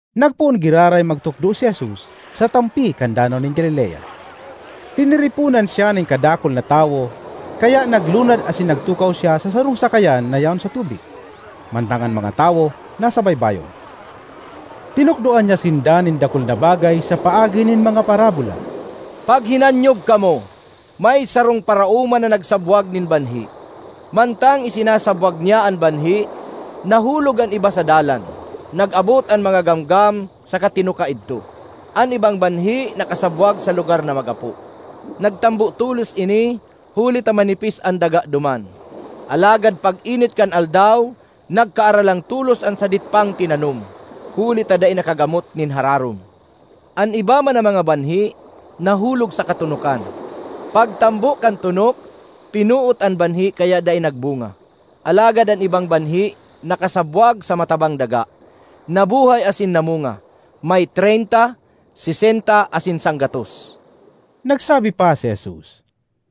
Nagpoon giraray magtukdo si Jesus sa tampi kan Danaw nin Galilea. Tiniriponan siya nin kadakul na tawo kaya naglunad asin nagtukaw siya sa sarong sakayan na yaon sa tubig, mantang an mga tawo nasa baybayon. Tinukdoan niya sinda nin dakul na bagay sa paagi nin mga parabola: ”Paghinanyog kamo! May sarong paraoma na nagsabwag nin banhi. Mantang isinasabwag niya an banhi, nahulog an iba sa dalan; nag-abot an mga gamgam saka tinuka idto. An ibang banhi nakasabwag sa lugar na magapo. Nagtambo tolos ini huli ta manipis an daga duman. Alagad pag-init kan aldaw nagkaaralang tolos an sadit pang tinanom, huli ta dai nakagamot nin hararom. An iba man na mga banhi nahulog sa katonokan. Pagtambo kan tonok pinoot an banhi kaya dai nagbunga. Alagad an ibang banhi nakasabwag sa matabang daga, nabuhay asin namunga: may treynta, sesenta, asin sanggatos.” Nagsabi pa si Jesus,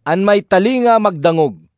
“An may talinga magdangog!”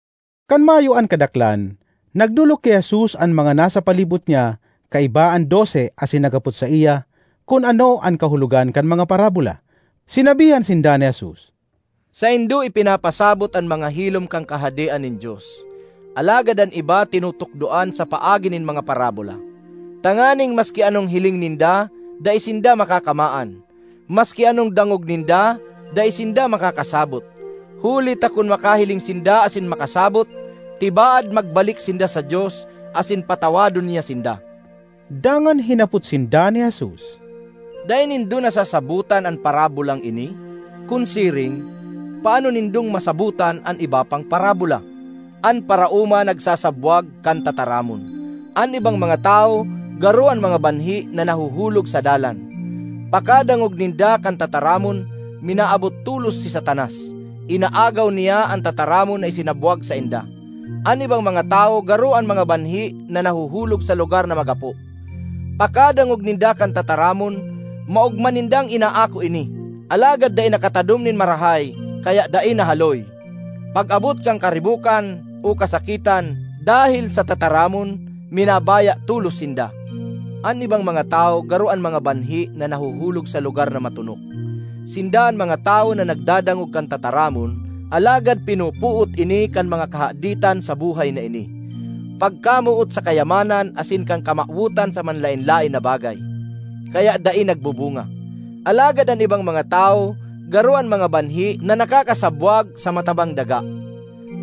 Kan mayo an kadaklan, nagdolok ki Jesus an mga nasa palibot niya kaiba an dose asin naghapot saiya kun ano an kahulogan kan mga parabola. Sinabihan sinda ni Jesus, “Saindo ipinapasabot an mga hilom kan Kahadean nin Dios, alagad an iba tinutukdoan sa paagi nin mga parabola, tanganing ‘maski anong hiling ninda, dai sinda makakamaan, maski anong dangog ninda, dai sinda makakasabot; huli ta kun makahiling sinda asin makasabot, tibaad magbalik sinda sa Dios asin patawadon niya sinda.’” Dangan hinapot sinda ni Jesus, “Dai nindo nasasabotan an parabolang ini? Kun siring, paano nindong masabotan an iba pang parabola? An paraoma nagsasabwag kan tataramon. An ibang mga tawo garo an mga banhi na nahuhulog sa dalan. Pakadangog ninda kan tataramon, minaabot tolos si Satanas; inaagaw niya an tataramon na isinabwag sainda. An ibang mga tawo garo an mga banhi na nahuhulog sa lugar na magapo. Pakadangog ninda kan tataramon, maogma nindang inaako ini. Alagad dai nakatadom nin marahay kaya dai nahaloy. Pag-abot kan karibokan o kasakitan dahel sa tataramon, minabaya tolos sinda. An ibang mga tawo garo an mga banhi na nahuhulog sa lugar na matonok. Sinda an mga tawo na nagdadangog kan tataramon, alagad pinopoot ini kan mga kahaditan sa buhay na ini, pagkamoot sa kayamanan asin kan kamawotan sa manlaen-laen na bagay. Kaya dai nagbubunga. Alagad an ibang mga tawo garo an mga banhi na nakakasabwag sa matabang daga.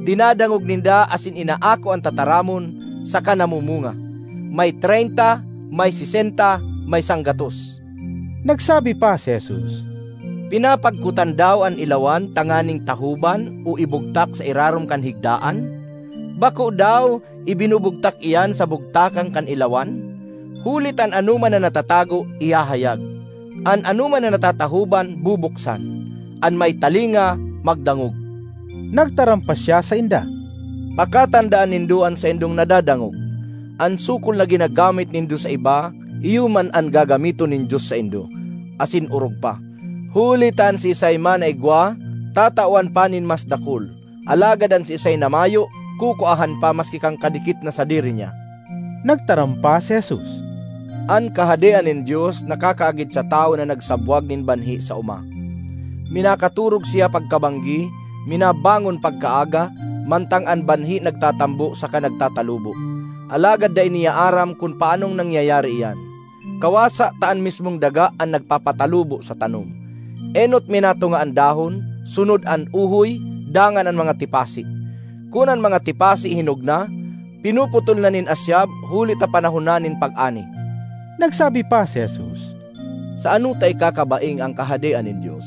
Dinadangog ninda asin inaako an tataramon, saka namumunga; may treynta, may sesenta, may sanggatos.” Nagsabi pa si Jesus, “Pinapagkotan daw an ilawan tanganing tahoban o ibugtak sa irarom kan higdaan? Bako daw ibinubugtak iyan sa bugtakan kan ilawan? Huli ta an anoman na natatago, ihahayag; an anoman na natatahoban, bubuksan. An may talinga, magdangog!” Nagtaram pa siya sainda, “Pakatandaan nindo an saindong nadadangog! An sukol na ginagamit nindo sa iba, iyo man an gagamiton nin Dios saindo, asin orog pa. Huli ta an siisay man na igwa, tatawan pa nin mas dakul; alagad an siisay na mayo, kukuahan pa maski kan kadikit na sadiri niya.” Nagtaram pa si Jesus, “An Kahadean nin Dios nakakaagid sa tawo na nagsabwag nin banhi sa oma. Minakatorog siya pagkabanggi, minabangon pagkaaga, mantang an banhi nagtatambo saka nagtatalubo. Alagad dai niya aram kun paanong nangyayari iyan. Kawasa ta an mismong daga an nagpapatalubo sa tanom: enot minatunga an dahon, sunod an uhoy, dangan an mga tipasi. Kun an mga tipasi hinog na, pinuputol na nin asyab, huli ta panahon na nin pag-ani.” Nagsabi pa si Jesus, “Sa ano ta ikakabaing an Kahadean nin Dios?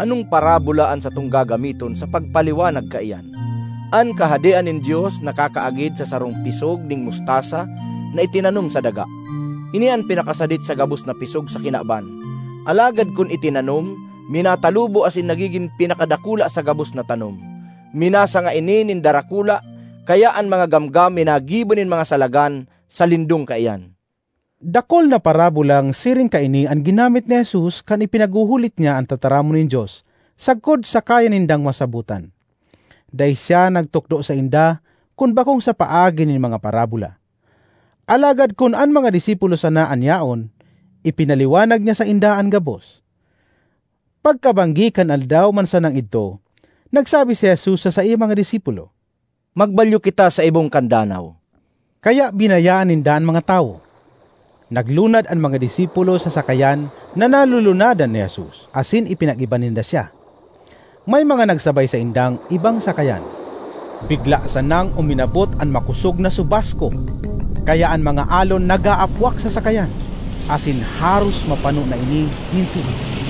Anong parabola an satong gagamiton sa pagpaliwanag kaiyan? An Kahadean nin Dios nakakaagid sa sarong pisog nin mustasa na itinanom sa daga. Ini an pinakasadit sa gabos na pisog sa kinaban. Alagad kun itinanom, minatalubo asin nagigin pinakadakula sa gabos na tanom. Minasanga ini nin darakula kaya an mga gamgam minagibo nin mga salagan sa lindong kaiyan.” Dakul na parabolang siring kaini an ginamit ni Jesus kan ipinaghuhulit niya an tataramon nin Dios sagkod sa kaya nindang masabotan. Dai siya nagtukdo sainda kun bakong sa paagi nin mga parabola, alagad kun an mga disipulo sana an yaon, ipinaliwanag niya sainda an gabos. Pagkabanggi kan aldaw man sanang idto, nagsabi si Jesus sa saiyang mga disipulo, “Magbalyo kita sa ibong kan danaw.” Kaya binayaan ninda an mga tawo; naglunad an mga disipulo sa sakayan na nalulunadan ni Jesus asin ipinag-iba ninda siya. May mga nagsabay saindang ibang sakayan. Bigla sanang uminabot an makosog na subasko kaya an mga alon nag-aapwak sa sakayan, asin haros mapano na ini nin tubig.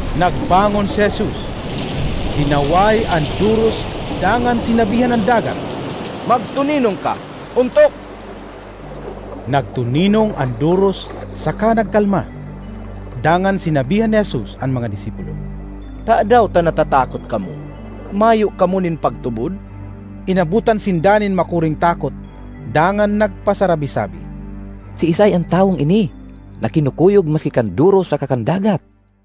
Nagbangon si Jesus, sinaway an doros dangan sinabihan an dagat, “Magtoninong ka! Ontok!” Nagtoninong an doros saka nagkalma. Dangan sinabihan ni Jesus an mga disipulo, “Tadaw ta natatakot kamo? Mayo kamo nin pagtubod?” Inabotan sinda nin makuring takot dangan nagpasarabi-sabi, “Siisay an tawong ini na kinukuyog maski kan doros saka kan dagat?”